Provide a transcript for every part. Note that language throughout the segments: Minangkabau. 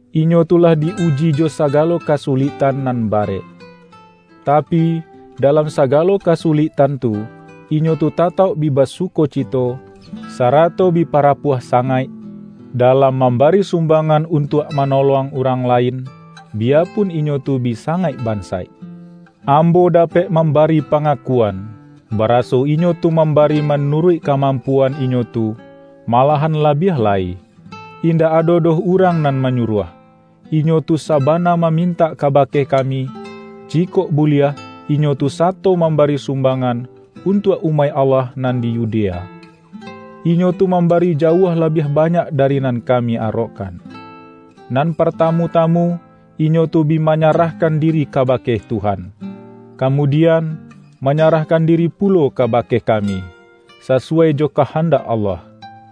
Inyo tu lah di-uji jo sagalo kasuliktan nan barek. Tapi, dalam sagalo kasuliktan tu, inyo tu tatauk bi basukocito, sarato bi pa-rapuah sangaik, dalam mambari sum-bangan untuak manolong urang lain, biyapun inyo tu bi sangaik bansaik. Ambo dapek mambari pangakuan, baraso inyo tu mambari manuruik ka-mampuan inyo tu, malahan labiah lai. Indak ado doh urang nan manyuruah, inyo tu sabana mamintak kabake ka-mi, jikok buliah inyo tu sato mambari sumbangan untuak umaik Allah nan di Yudea. Inyo tu mambari jauah la-biah banyak dari nan kami arokkan. Nan partamu-tamu, inyo tu bi manya-rahkan diri kabake Tuhan, kamudian, manyarahkan diri pulo kabake kami, sasuwai jo kahandak Allah.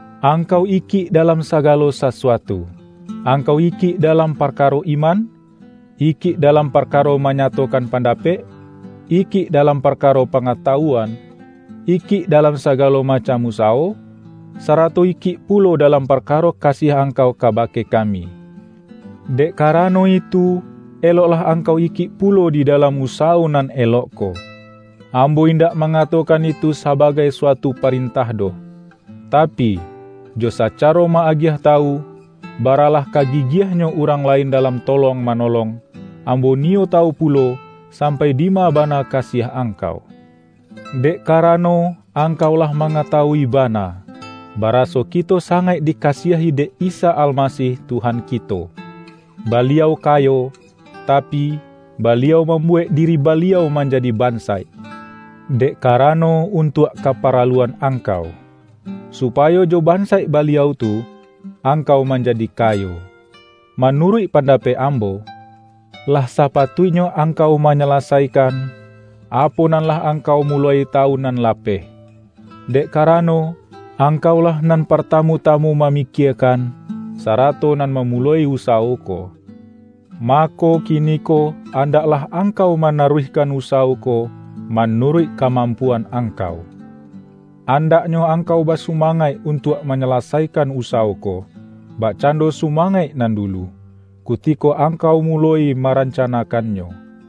Angkau ikik dalam sagalo sasu-atu: Angkau ikik dalam parkaro iman, ikik dalam parkaro manyatokan pan-dapek, ikik dalam parkaro pangata-wuan, ikik dalam sagalo macam usa-wo, sarato ikik pulo dalam parkaro kasiah angkau kabake kami. Dek ka-rano itu, eloklah angkau ikik pulo di dalam usawo nan elok ko. Ambo indak mangatokan itu saba-gai suatu parentah doh. Tapi, jo saca-ro ma-agiah tawu, baralah ka gigiah-nyo urang lain dalam tolong manolong, ambo niyo tawu pulo, sampai dima ba-na kasiah angkau. Dek karano, ang-kau lah mangatawui bana, baraso ki-to sangaik dikasiahi dek Isa Almasih Tuhan kito. Baliau kayo, tapi, Baliau mambuwek diri Baliau manjadi ban-saik, dek karano untuak kaparaluan angkau, supayo jo bansaik Baliau tu, angkau manjadi kayo. Manuruik pandapek ambo, lah sa-patuiknyo angkau manyalasaikan, apo nan lah angkau muloi tawun nan lapeh. Dek karano, angkaulah nan par-tamu-tamu mamikiekan, sarato nan mamuloi usawo ko. Mako, kiniko andaklah angkau manaruihkan usawo ko manuruik kamampuan angkau. An-daknyo angkau basumangaik untuak manyalasaikan usawo ko, bakcando sumangaik nan dulu, kutiko angkau muloi marancanakannyo.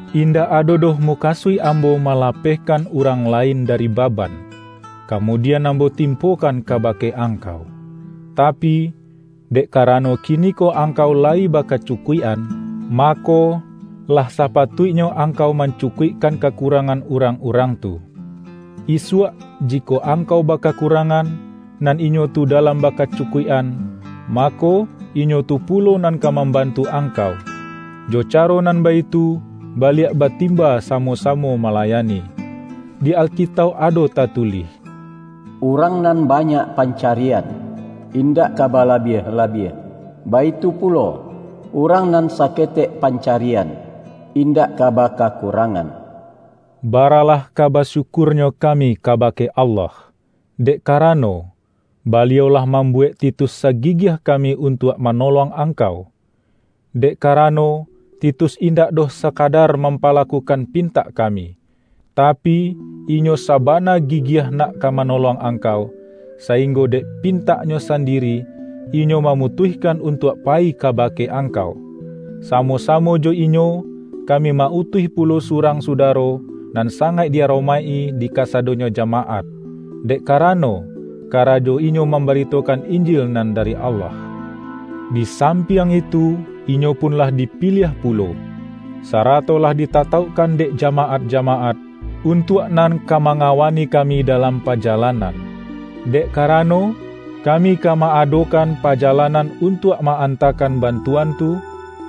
Indak ado doh mukasuik ambo malapehkan urang lain dari baban, ka-mudian ambo timpokan kabake ang-kau. Tapi, dek karano kiniko angkau layi bakacukuik-an, mako, lah sapa-tuiknyo angkau mancukuikkan ka-kurangan urang-urang tu. Isuak, ji-kok angkau bakakurangan, nan inyo tu dalam bakacukuik-an, mako, inyo tu pulo nan ka mambantu angkau. Jo caro nan baitu, baliak batimba samo-samo malayani. Di Alkitauk ado ta-tulih,”Urang nan banyak pancarian, indak ka balabiah-labiah, baitu pulo, urang nan saketek pancarian, indak ka bakakurangan.” Baralah ka basyukurnyo kami ka-bake Allah, dek karano, Baliau lah mambuwek Titus sagigiah kami untuak manolong angkau! Dek karano, Ti-tus indak doh sakadar mampalakukan pintak kami, tapi, inyo sabana gigiah nak ka manolong angkau, sainggo dek pintaknyo sandiri, inyo mamutuihkan untuak payi kabake angkau. Samo-samo jo inyo, kami ma-utuih pulo su-rang sudaro, nan sangaik di-aromaik-i di kasadonyo jamaat, dek karano, ka-rajo inyo mambaritokan Injil nan dari Allah. Di sampiang itu, inyo pun lah dipiliah pulo, sarato lah ditatauk-kan dek jamaat-jamaat, untuak nan ka mangawani kami dalam pajalan-an. Dek karano, kami ka ma-adokan pajalanan untuak ma-antakan bantu-an tu,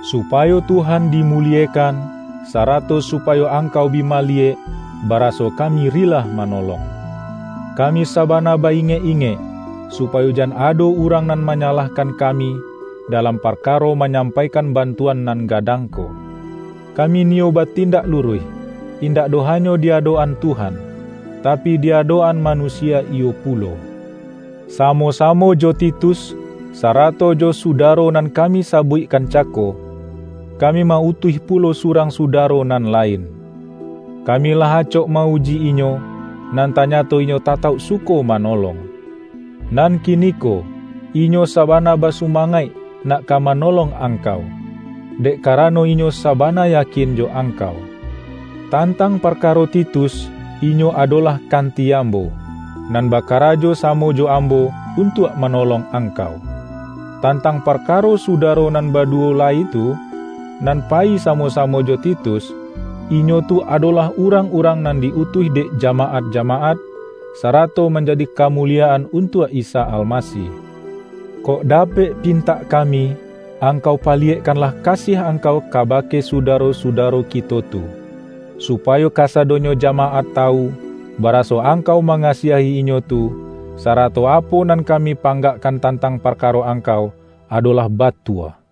supayo Tuhan dimuliekan, sa-rato supayo angkau bi maliyek, bara-so kami rilah manolong. Kami sabana ba-ingek-ingek, su-payo jan ado urang nan manyalahkan kami, dalam parkaro manyampaikan bantuan nan gadang ko. Kami niyo batindak luruih, indak doh hanyo di adok-an Tuhan, tapi, di adok-an ma-nusia iyo pulo. Samo-samo jo Titus, sarato jo su-daro nan kami sabuikkan cako, ka-mi ma-utuih pulo surang sudaro nan lain. Kami lah acok ma-uji inyo, nan tanyato inyo tatauk suko manolong. Nan kiniko, inyo sabana basumangaik nak ka manolong angkau, dek karano inyo sabana yakin jo angkau. Tan-tang parkaro Titus, inyo adolah kanti ambo, nan bakarajo samo jo ambo un-tuak manolong angkau. Tantang parka-ro sudaro nan baduwo lai tu, nan pa-yi samo-samo jo Titus, inyo tu adolah urang-urang nan di-utuih dek jama-at-jamaat, sarato manjadi kamuliyaan untuak Isa Almasih. Kok dapek pin-tak kami, angkau paliyekkanlah kasiah angkau kabake sudaro-sudaro kito tu, supayo kasadonyo jamaat tawu, bara-so angkau mangasiahi inyo tu, sara-to apo nan kami panggakkan tantang parkaro angkau, adolah batua.